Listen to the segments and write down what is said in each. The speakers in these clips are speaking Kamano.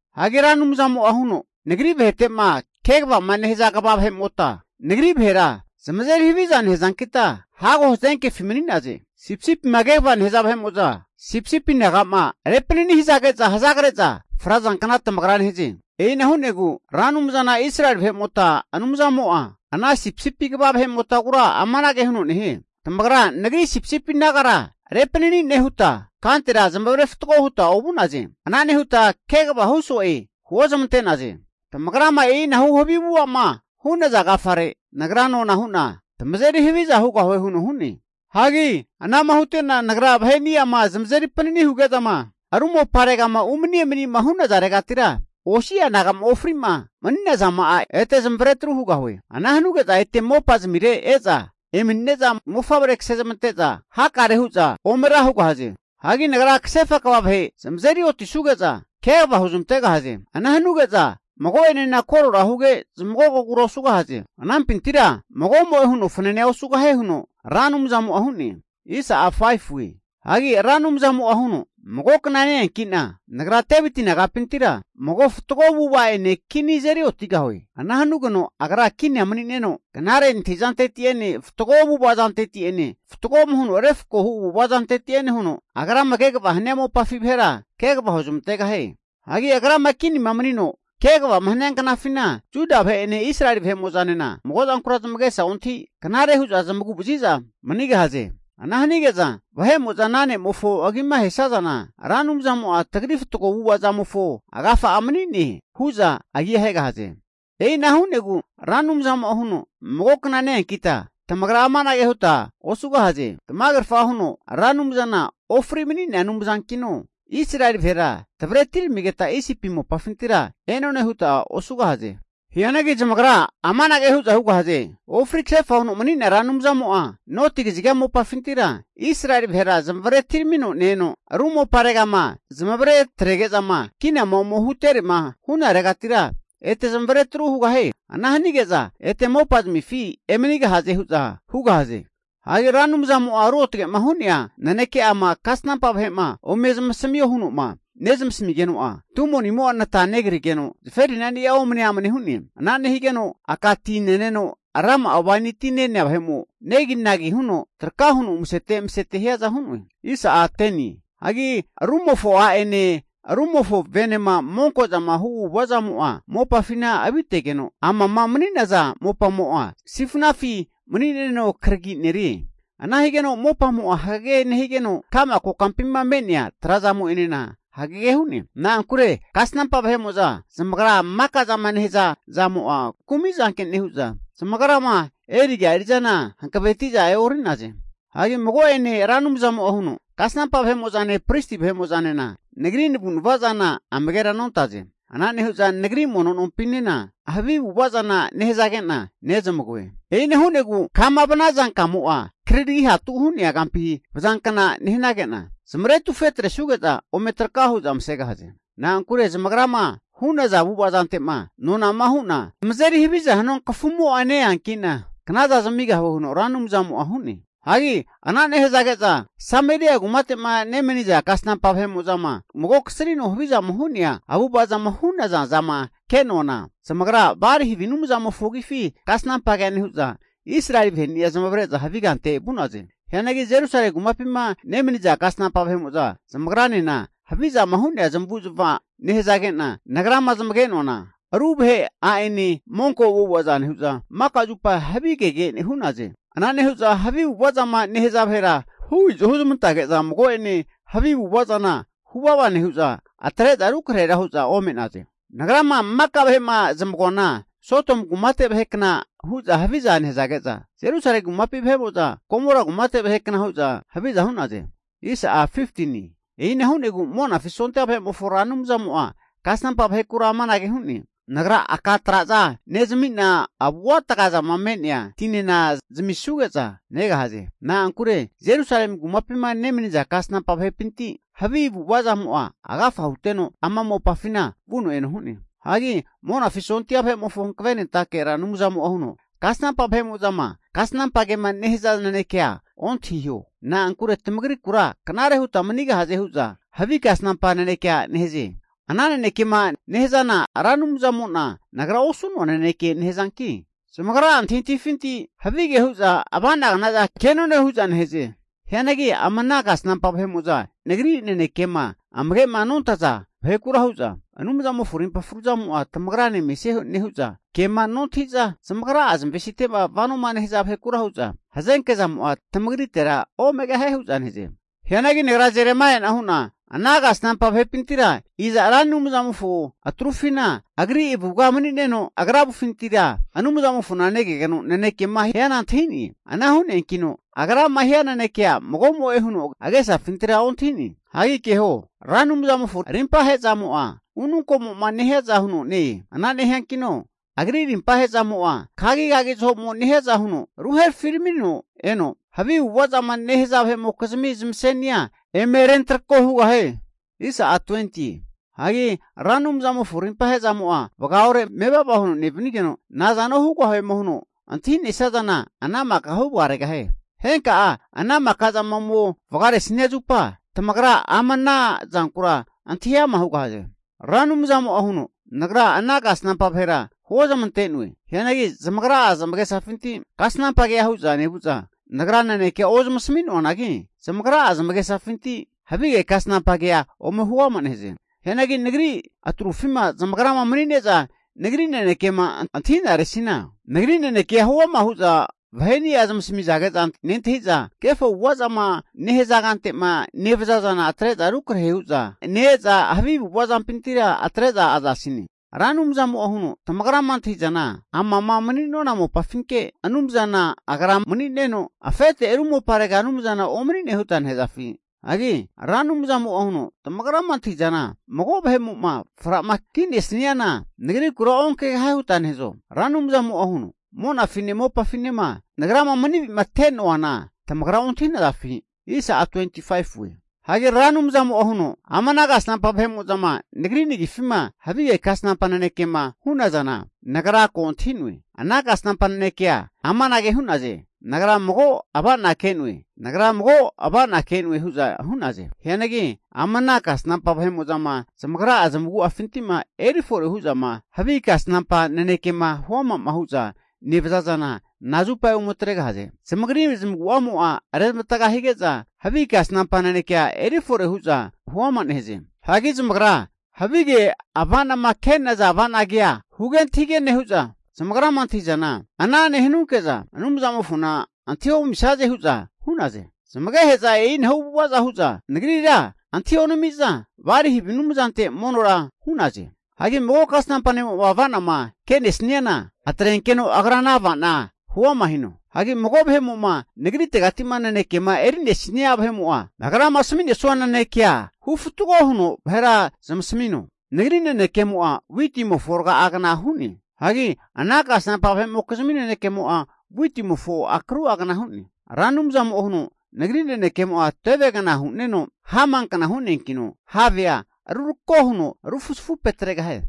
Hagi Ra Anumzamo'a huno, Nagri vahetema kegavama nehaza kva vahe'mota, Nagri vahera zamazeri haviza nehazankita, hago hazenkefi mani'naze. Sipisipima kegavama nehaza vahe'mo'za sipisipi naga'ma repanani hazage'za hazagre'za frazankna tamagra nehaze. E'ina hu'negu Ra Anumzana Israeli vahemota Anumzamo'a ana sipisipi kva vahe'motagura amanage huno nehie. Tamagra Nagri sipisipi nagara repanani nehuta, kantera zamavare fatgo huta ovu'naze. Ana nehuta kegava hu so'e huozamante'naze. Tamagrama e'inahu havi avu'ava zama hu'naza agafare Nagra nona hu'na tamazeri haviza hugahue huno hu'ne. Hagi ana'ma hute'na Nagra vaheni'ama zamazeri panani huge'zama ru moparegama umani emanima hu'nazaregatira, osi'a naga'ma ofri'ma mani'nazama'a ete zamavare tru hugahue. Ana hanuge'za ete mopa zamire e'za emanine'za mofavrea kasezmante'za hakare hu'za ome ra hugahaze. Hagi Nagra kasefa kva vahe zamazeri otisuga'za kegava huzmantegahaze. Ana hanuge'za mago'enena korora huge zmagogogura osugahaze. Anampintira magomo'e huno fananea osugahie huno Ra Anumzamo'a hu'ne. Hagi Ra Anumzamo'a huno, magokna ne-eanki'na Nagra Deviti nagapintira mago fatgo avu'ava ene kini ne' azeri otigahue. Ana hanugeno agra kinia mani'neno, knare antahi zanteti'ene fatgo avu'ava zanteti'ene fatgoma huno refkoma hu avu'avazante'ene huno agrama kegavama hania mopafi vahera kegava huzmantegahie. Hagi agrama kinima manino kegavama hania knafina, Juda vahe'ene Israeli vahe'mo'zanena mago zankura zamagesa ontahi knare hu'za zamagu'vazi'za manigahaze. Ana hanage'za vahe'mo'za ana ne'mofo agima ahesazana, Ra Anumzamo'a tagri fatgo avu'ava zamofo agafa'a mani'ne hu'za agia ahegahaze. E'ina hu'negu Ra Anumzamo'a huno, mago kna ne-eankita tamagra amanage huta osugahaze. Tamagerfa huno Ra Anumzana ofri mani'nea Anumzankino, Israeli vahera tavre atiramigeta Isipi mopafintira e'none huta osugahaze. Hianagi zamagra amanage hu'za hugahaze. Ofri kasefa huno mani'nea Ra Anumzamo'a noti kaziga mopafintira Israeli vahera zamavare atiramino ne-eno, ru moparegama zamavare trege'zama kinama ome huterema hu'naregatira ete zamavare atru hugahie. Ana hanige'za ete mopazamifi emanigahaze hu'za hugahaze. Hagi Ra Anumzamo'ma ruotage'ma hu'nea naneke'ama kasnampa vahe'ma ome zamasamio huno'ma nenasamigeno'a, tumo'nimo'a nata negrigeno zaferinani'a omne amne hu'ne. Ana nehigeno aka ti ne'neno rama'a waini ti ne'nea vahe'mo, negi nagi nehuno traka huno umasete emasete hiaza hu'noe. Hagi rumofo a'ene rumofo venema monko'zama hu avu'ava'zamo'a mopafina avitegeno, amama mani'naza mopamo'a sifnafi mani'neno kragi'nerie. Ana higeno mopamo'a hagege nehigeno, ka'ma kokampima me'nea trazamo'enena hagege hu'ne. Na'ankure kasnampa vahe'mo'za maka'zama nehaza zamo'a kumi zanke nehu'za, zamagrama eriga eri'zana hankaveti'za e'ori'naze. Hagi mago'ene Ra Anumzamo'a huno, Kasnampa vahemo'zane pristi vahemo'zanena Nagri navu'nava zana amagera nontaze. Ana nehu'za Nagri mono nompinena havi avu'ava zana nehazage'na nezamagoe. E'ina hu'negu kama vanaza kamo'a kriri hatu hu'nea kampi vazankna nehanage'na, zamaretufe atresuge'za ome traka hu'za masegahaze. Na'ankure zamagrama hu'naza avu'ava zante'ma nonama hu'na zamazeri haviza hanua kafumo'a ne-eanki'na, knaza zamigahue huno Ra Anumzamo'a hu'ne. Hagi ana nehazage'za Samelia kumate'ma nemaniza kasnampa vahe'mo'zama mago kasrino havizama hu'nea avu'ava zama hu'naza zama ke'noana, zamagra Bali havi anumzamofo agifi kasnampa kea nehu'za, Israeli vaheni'a zamavare'za havi kante vu'naze. Hianagi Jerusalemi kumapima nemaniza kasnampa vahe'mo'za zamagranena, havizama hu'nea zamavu'zmava zama nehazage'na Nagrama zamage'noana, ru vahe a'nene monko avu'avaza nehu'za, maka zupa havige kege hu'naze. Ana nehu'za havi avu'ava zama nehaza vahera hu izo huzmantage'za mago'ene havi avu'ava zana huvava nehu'za atre'za rukrahera hu'za ome'naze. Nagrama maka vahe'ma zamagoana Sodomu kumate vahe kna hu'za haviza nehazage'za, Jerusalemi kumapi vahe'mo'za Gomora kumate vahe kna hu'za haviza hu'naze. E'ina hu'negu Monafi sondia vahe'mofo Ra Anumzamo'a kasnampa vahekura amanage hu'ne, Nagra aka traza nezamina avuataga zama me'nea tinena zamisuge'za negahaze. Na'ankure Jerusalemi kumapima nemaniza kasnampa vahepinti havi avu'ava zamo'a agafa huteno ama mopafina vuno eno hu'ne. Hagi Monafi sondia vahe'mofo hankavenentake Ra Anumzamo'a huno, Kasnampa vahe'mo'zama kasnampa kema nehaza nanekea ontahiho. Na'ankure tamagrikura knare huta manigahaze hu'za havi kasnampa nanekea nehaze. Ana nanekema nehazana Ra Anumzamo'na Nagra osu'noa naneke nehazanki, zamagra'a antahintahifinti havige huza ava'nagna zana ke'none huza nehaze. Hagi ama ana kasnampa vahe'mo'za Nagri nanekema amage'ma nontaza vahekura hu'za, Anumzamofo rimpa fru zamo'a tamagrane mesie nehu'za, kema nontahi'za zamagra'a zamavesite'ma vanoma nehaza vahekura hu'za, hazenke zamo'a tamagritera omegahie hu'za nehaze. Hianagi nagra Jeremaia'na hu'na, ana kasnampa vahepintira iza Ra Anumzamofo atrufina Agri avuga mani'neno, agra avufintira Anumzamofona negeno nanekema hiana antahi'ne? Ana hu'neankino Agrama hia nenekea mago'mo'e huno agesafintira ontahi'ne. Hagi keho! Ra Anumzamofo arimpahe zamo'a, ununkomo'ma nehiaza huno ne-e. Ana nehiankino Agri rimpa ahe'zamo'a kagikagi zahomo nehiaza huno ruherafi ramino eno, havi avu'ava zama nehaza vahe'mokizmi zamasenia eme rentrako hugahie. Hagi Ra Anumzamofo arimpa ahe'zamo'a vagaore mevava huno nevanigeno, nazano hugahuema huno antahi'nesia zana ana maka huvagaregahie. Henka'a ana maka zama ome vagaresania zupa, tamagra ama ana zankura antahi ama' hugahaze. Ra Anumzamo'a huno, Nagra ana kasnampa vahera huozamante'noe. Hianagi zamagra'a zamagesafinti kasnampa kea hu'za nevu'za, Nagra nanekea ozamasami noanagi, zamagra zamagesafinti havi kasnampa kea ome huama nehaze. Hianagi Nagri atrufima zamagra mani'ne'za nagri nanekema antahi'naresina, Nagri nanekea huama hu'za vaheni'a zamasamizage'za nentahi'za, kefo avu'azama nehaza kante'ma nevaza zana atre'za rukrahe hu'za ne-eza, havi avu'ava zampintira atre'za azasine. Ra Anumzamo'a huno, Tamagrama antahi'zana, amama mani'nona mopa'afinke Anumzana Agra mani'neno, afete ru moparega Anumzana omani'ne huta nehazafi? Hagi Ra Anumzamo'a huno, tamagrama antahi'zana mago vahemo'ma fra'ma ki'nesaniana Nagrikura onkegahie huta nehazo? Ra Anumzamo'a huno, monafine mopafinema Nagrama mani avi'mate'noana tamagra ontahi'nazafi? Hagi Ra Anumzamo'a huno, ama ana kasnampa vahe'mo'zama Nagri nagifima havige kasnampa nanekema hu'nazana, nagra ko antahi'noe. Ana kasnampa nanekea amanage hu'naze. Nagra mago ava'na ke'noe, nagra mago ava'na ke'noe hu'za hu'naze. Hagi ama ana kasnampa vahe'mo'zama zamagra'a zamagu'afinti'ma eri fore hu'zama havi kasnampa nanekema huama'ma hu'za nevaza zana, nazupa ome atregahaze. Zamagrira zamagu'amo rezmavatga hige'za havi kasnampa naneke eri fore hu'za huama nehaze. Hagi zamagra havige ava'nama ke'naza ava'na kea huge antahige nehu'za, zamagrama antahi'zana ana nehanunke'za Anumzamofona antahi omisaze hu'za hu'naze. Zamagehe'za e'inahu avu'avaza hu'za Nagrira antahi onami'za Bali havi anumzante monora hu'naze. Hagi mago kasnampa ne'mo'ma ava'nama ke'nesaniana atrenkeno agra ana ava'na huama hino. Hagi mago vahe'mo'ma Nagritegati'ma nanekema eri'nesania vahe'mo'a Nagrama asami'nesanua nanekea hu fatgo huno vahera zamasamino. Nagri nanekemo'a witimofo raga'agna hu'ne. Hianagi ana kasnampa vahe'mokizimi nanekemo'a witimofo akrua gna hu'ne. Ra Anumzamo'a huno, Nagri nanekemo'a tevegna hune'no, hamankna hu'neankino havea rufrageno rako huno rufuzafu petregahie.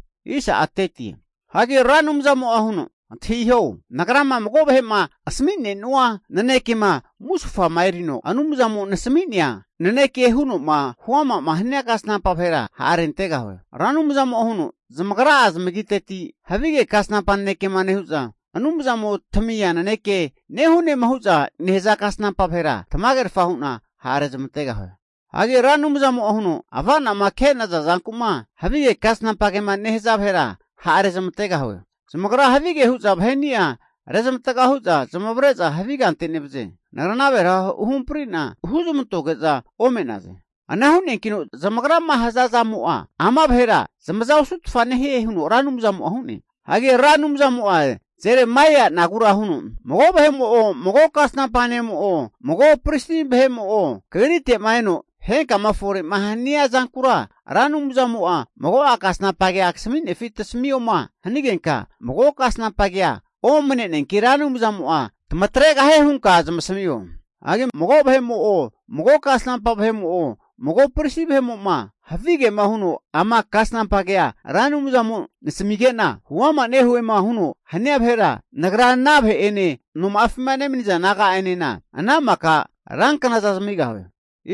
Hagi Ra Anumzamo'a huno, Antahiho! Nagrama mago vahe'ma asami'nenua nanekema musufama erino, Anumzamo nesami'nea naneke huno'ma huama'ma hania kasnampa vahera ha'rentegahue. Ra Anumzamo'a huno, zamagra'a zamagiteti havi kasnampa nanekema nehu'za, Anumzamo tamia naneke nehunema hu'za nehaza kasnampa vahera tamagerfa hu'na ha' rezamantegahue. Hagi Ra Anumzamo'a huno, Ava'nama ke'naza zanku'ma havi kasnampa kema nehaza vahera ha' rezamantegahue. Zamagra havige hu'za vaheni'a rezamatga hu'za zamavare'za havi kante nevaze. Nagra ana vahera huhamparite'na huzamantoge'za ome'naze. Ana hu'neankino zamagrama haza zamo'a ama vahera zamaza osutfa nehie, huno Ra Anumzamo'a hu'ne. Hagi Ra Anumzamo'a Jeremaianagura huno, Mago vahemo'o, mago kasnampa nemo'o, mago pristi vahemo'o kagrite'ma eno, henkama fore'ma hania zankura Ra Anumzamo'a mago'a kasnampa kea kasaminefi tasamioma hanagenka, mago kasnampa kea omneneanki, Ra Anumzamo'a tamatregahie hunka zamasamio. Hagi mago vahe'mo'o, mago kasnampa vahe'mo'o mago pristi vahemo'ma havigema huno ama kasnampa kea Ra Anumzamo nasamige'na huama nehuema huno hania vahera, Nagra ana vahe'ene noma'afima nemaniza naga'enena ana maka ranknaza zamigahue.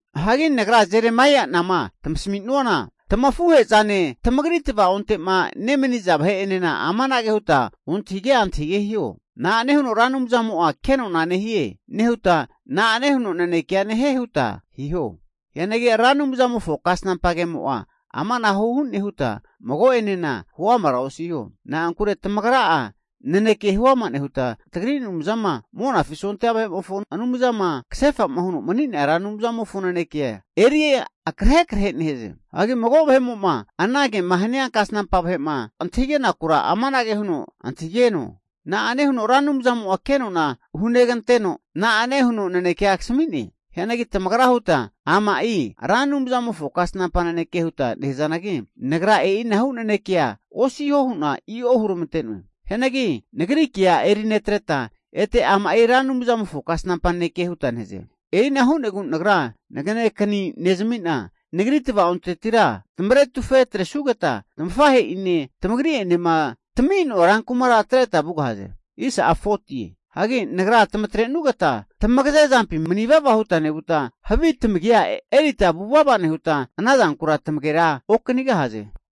Hagi nagra Jeremaia'nama tamasami'nuana, tamafuhe'zane tamagri tavaonte'ma nemaniza vahe'enena amanage huta ontahige antahige hiho. Na'ane huno Ra Anumzamo'a kenona nehie nehuta, na'ane huno nanekea nehie? huta hiho. Hianagi Ra Anumzamofo kasnampa kemo'a amanahu hune huta mago'enena huamara osiho. Na'ankure tamagra'a naneke huama nehuta, tagri Anumzama Monafi sondia vahe'mofo Anumzama kasefa'ma huno mani'nea Ra Anumzamofo nanekea eri akrahe krahu nehaze. Hagi mago vahemo'ma ana kema hania kasnampa vahe'ma antahigenakura amanage huno antahigeno. Na'ane huno Ra Anumzamo'a kenona huneganteno, na'ane huno nanekea kasami'ne? Hianagi tamagra huta ama'i Ra Anumzamofo kasnampa naneke huta nehazanagi, Nagra e'inahu nanekea osiho hu'na i'o huramante'noe. Hianagi Nagri kea eri netreta, ete ama'i Ra Anumzamofo kasnampa naneke huta nehaze. E'ina hu'negu Nagra naganekani nezami'na, Nagri tava'ontetira tamaretufe atresugeta, tamafahe'ine tamagri'enema tami'noa rankumara atreta vugahaze. Hagi Nagra tamatrenugeta tamagaze zampi mani vava huta nevuta, havi tamagia erita vuvava nehuta anazankura tamagera okanigahaze.